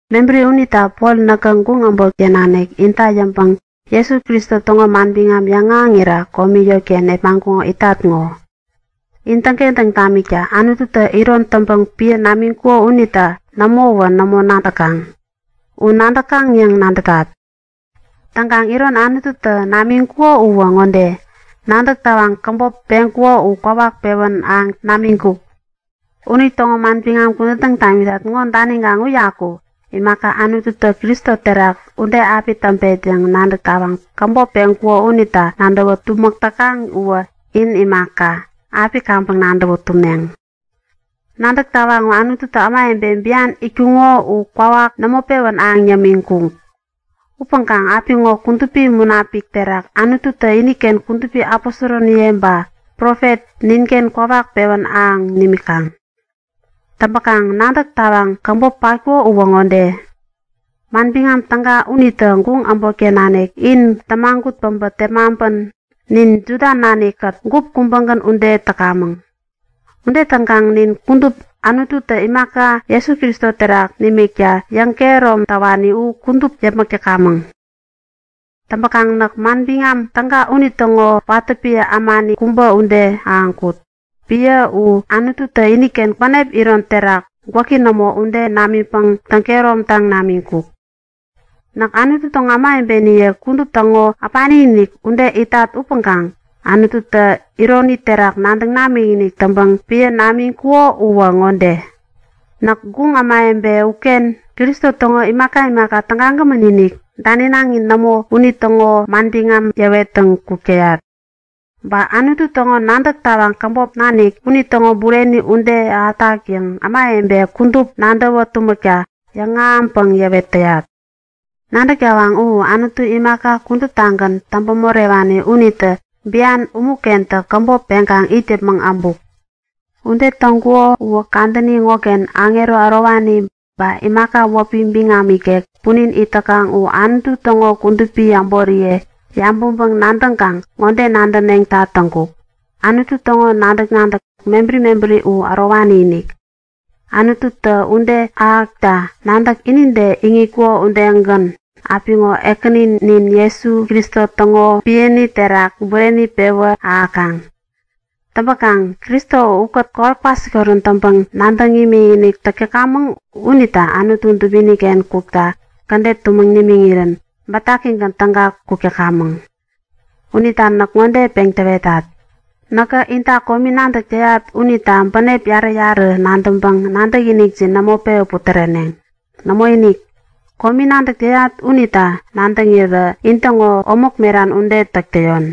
Mebäri unita Pol näkä guŋ äbotken nanik inta yäŋpäŋ Jesu Kristo täŋo manbiŋam yäŋahäŋira komi eŋiken nepmaŋkuŋo itat ŋo. In täŋkentäŋ tamikta Anututä iron täŋpäŋ piä namiŋkuko unita nämowä nämo nadäkaŋ! U nadäkaŋ yäŋ nadätat. Täŋkaŋ iron Anututä namiŋkuko uwä ŋode; Nadäk tawaŋ käbop peŋkuko u kwawak pewän ahäŋ namiŋkuk. Unitäŋo manbiŋam kudän täŋ tamitat ŋo daniŋkaŋ uyaku imaka Anututä Kristo terak ude api täŋpet yäŋ nadäk tawaŋ käbop peŋkuko unita nadäwa tumäk täkaŋ uwä in imaka, api kaŋpäŋ nadäwä tumneŋ. Nadäk tawaŋ u Anututä ämawebe bian itkuŋo u kwawak nämo pewän ahäŋ yämiŋkuk. Upäŋkaŋ apiŋo Kudupi Munapik terak Anututä iniken kudupi aposoroniye ba profet ninken kwawak pewän ahäŋ nimikaŋ. Täŋpäkaŋ nadäk tawaŋ käbop patkuko uwä ŋode; Manbiŋam Täga unitä guŋ äbotken nanik in tämagut päbä tepmaŋpän nin Juda nanik-kät gup kubägän ude täkamäŋ. Ude täŋkaŋ nin kudup Anututä imaka Jesu Kristo terak nimikta yäŋkehärom täwani u kudup yäpmäk täkamäŋ. Täŋpäkaŋ näk Manbiŋam Täga unitäŋo watä piä ämani kubä ude ahäŋkut. Piä u Anututä iniken bänep iron terak, gwäki nämo ude namiŋpäŋ täŋ-kehäromtaŋ namiŋkuk. Näk Anutu täŋo kudupi ämawebeniye kudup täŋo äpani-inik ude itat upäŋkaŋ Anututä ironi terak nadäŋ namikinik täŋpäŋ piä namiŋkuko uwä ŋode; Näk guŋ ämawebe uken Kristo täŋo imaka imaka tägagämän-inik daninaŋi nämo unitäŋo manbiŋam yäwettäŋ kuk täyat. Ba Anutu täŋo nadäk tawaŋ käbop nanik unitäŋo bureni ude ahätak yäŋ ämawebe kudup nadäwä tumäkta yäŋahäŋpäŋ yäwet täyat. Nadäk tawaŋ u Anutu imaka kuduptagän täŋpä-morewani unitä bian umu-kentä käbop peŋkaŋ it yäpmäŋ äbuk. Ude täŋkuko uwä kadäni ŋoken aŋero ärowani ba imaka wäpi biŋam ikek punin it täkaŋ u Anutu täŋo kudupi äboriye yabäŋpäŋ-nadäŋkaŋ ŋode nadäneŋta täŋkuk; Anutu täŋo nadäk-nadäk mebäri mebäri u ärowani-inik! Anututä ude ahäkta nadäk inide iŋitkuko udegän apiŋo Ekäninin Kristo Jesu täŋo piäni terak bureni pewän ahäkaŋ. Täŋpäkaŋ Kristo ukät kowat kwasikorän täŋpäŋ nadäŋ imikinik täk täkamäŋ unita Anutu dubini-ken kukta kädet tumäŋ nimiŋirän bätakigän täga kuk täkamäŋ. Unita näk ŋode peŋ täwetat; Näkä inta komi nadäk täyat unita bänep yarä-yarä nadäŋpäŋ nadäkinikjin nämo pewä putäreneŋ. Nämoinik! Komi nadäk täyat unita nadäŋirä intäŋo omäk meran ude täk täyon.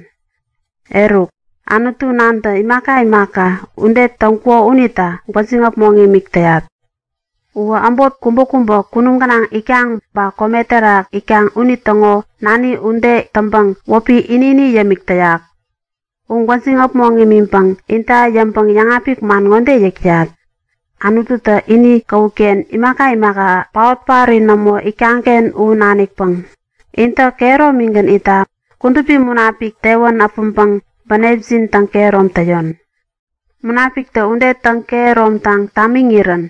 Eruk, Anutu Nantä imaka imaka ude täŋkuko unita gwäjiŋ äpmoŋ imik täyat. Uwä äbot kubäkubä kunum gänaŋ itkaŋ ba kome terak itkaŋ unitäŋo nani ude täŋpäŋ wäpi ini-ini yämik täyak. U gwäjiŋ äpmoŋ imiŋpäŋ inta yäŋpäŋ yäŋapik man ŋode yäk täyat; Anututä ini käwut-ken imaka imaka paot-paori nämo itkaŋ-ken u nanikpäŋ intä kehäromigän itta Kudupi Munapik tewän äpäŋpäŋ bänepjin täŋkehärom täyon. Munapiktä ude täŋ-kehäromtaŋ tamiŋirän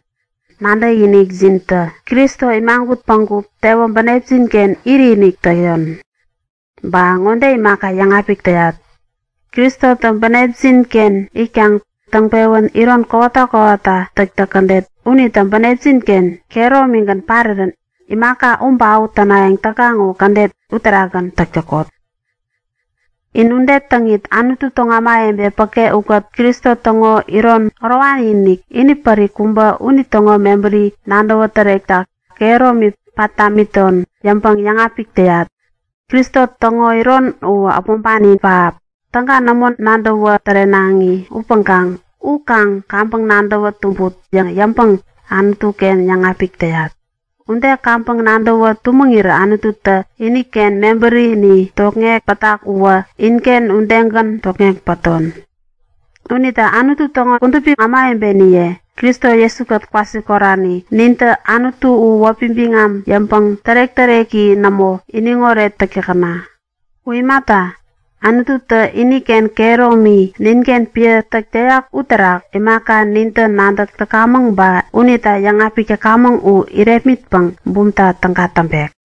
nadäkinikjintä Kristo imagut päŋku tewä bänepjin-ken iritinik täyon. Ba ŋode imaka yäŋapik täyat; Kristotä in bänepjin-ken itkaŋ täŋpewän iron kowata kowata täktäk kädet unitä bänepjin-ken kehäromigän parirän imaka u ba u tänayäŋ täkaŋ u kädet uterakgän täk täkot. In ude täŋit Anutu täŋo kudupi ämawebe päke ukät Kristo täŋo iron ärowani-inik, inipärik kubä unitäŋo mebäri nadäwä tärekta kehäromi pat tamiton yäŋpäŋ yäŋapik täyat. Kristo täŋo iron u äpmoŋpani pähap, täga nämo nadäwä tärenaŋi upäŋkaŋ u kaŋ kaŋpäŋ nadäwä tumbut yäŋ yäŋpäŋ Anutu-ken yäŋapik täyat. Ude kaŋpäŋ nadäwä tumäŋirä Anututä iniken mebärini tokŋek pätak uwä inken udegän tokŋek päton. Unita Anutu täŋo kudupi ämawebeniye, Kristo Jesu-kät kwasikorani nintä Anutu u wäpi biŋam yäŋpäŋ tärek-täreki nämo iniŋoret täk täkäna! U imata, Anututä iniken kehäromi ninken piä täk täyak uterak imaka nintä nadäk täkamäŋ ba unita yäŋapik täkamäŋ u irepmitpäŋ bumta täga täŋpek.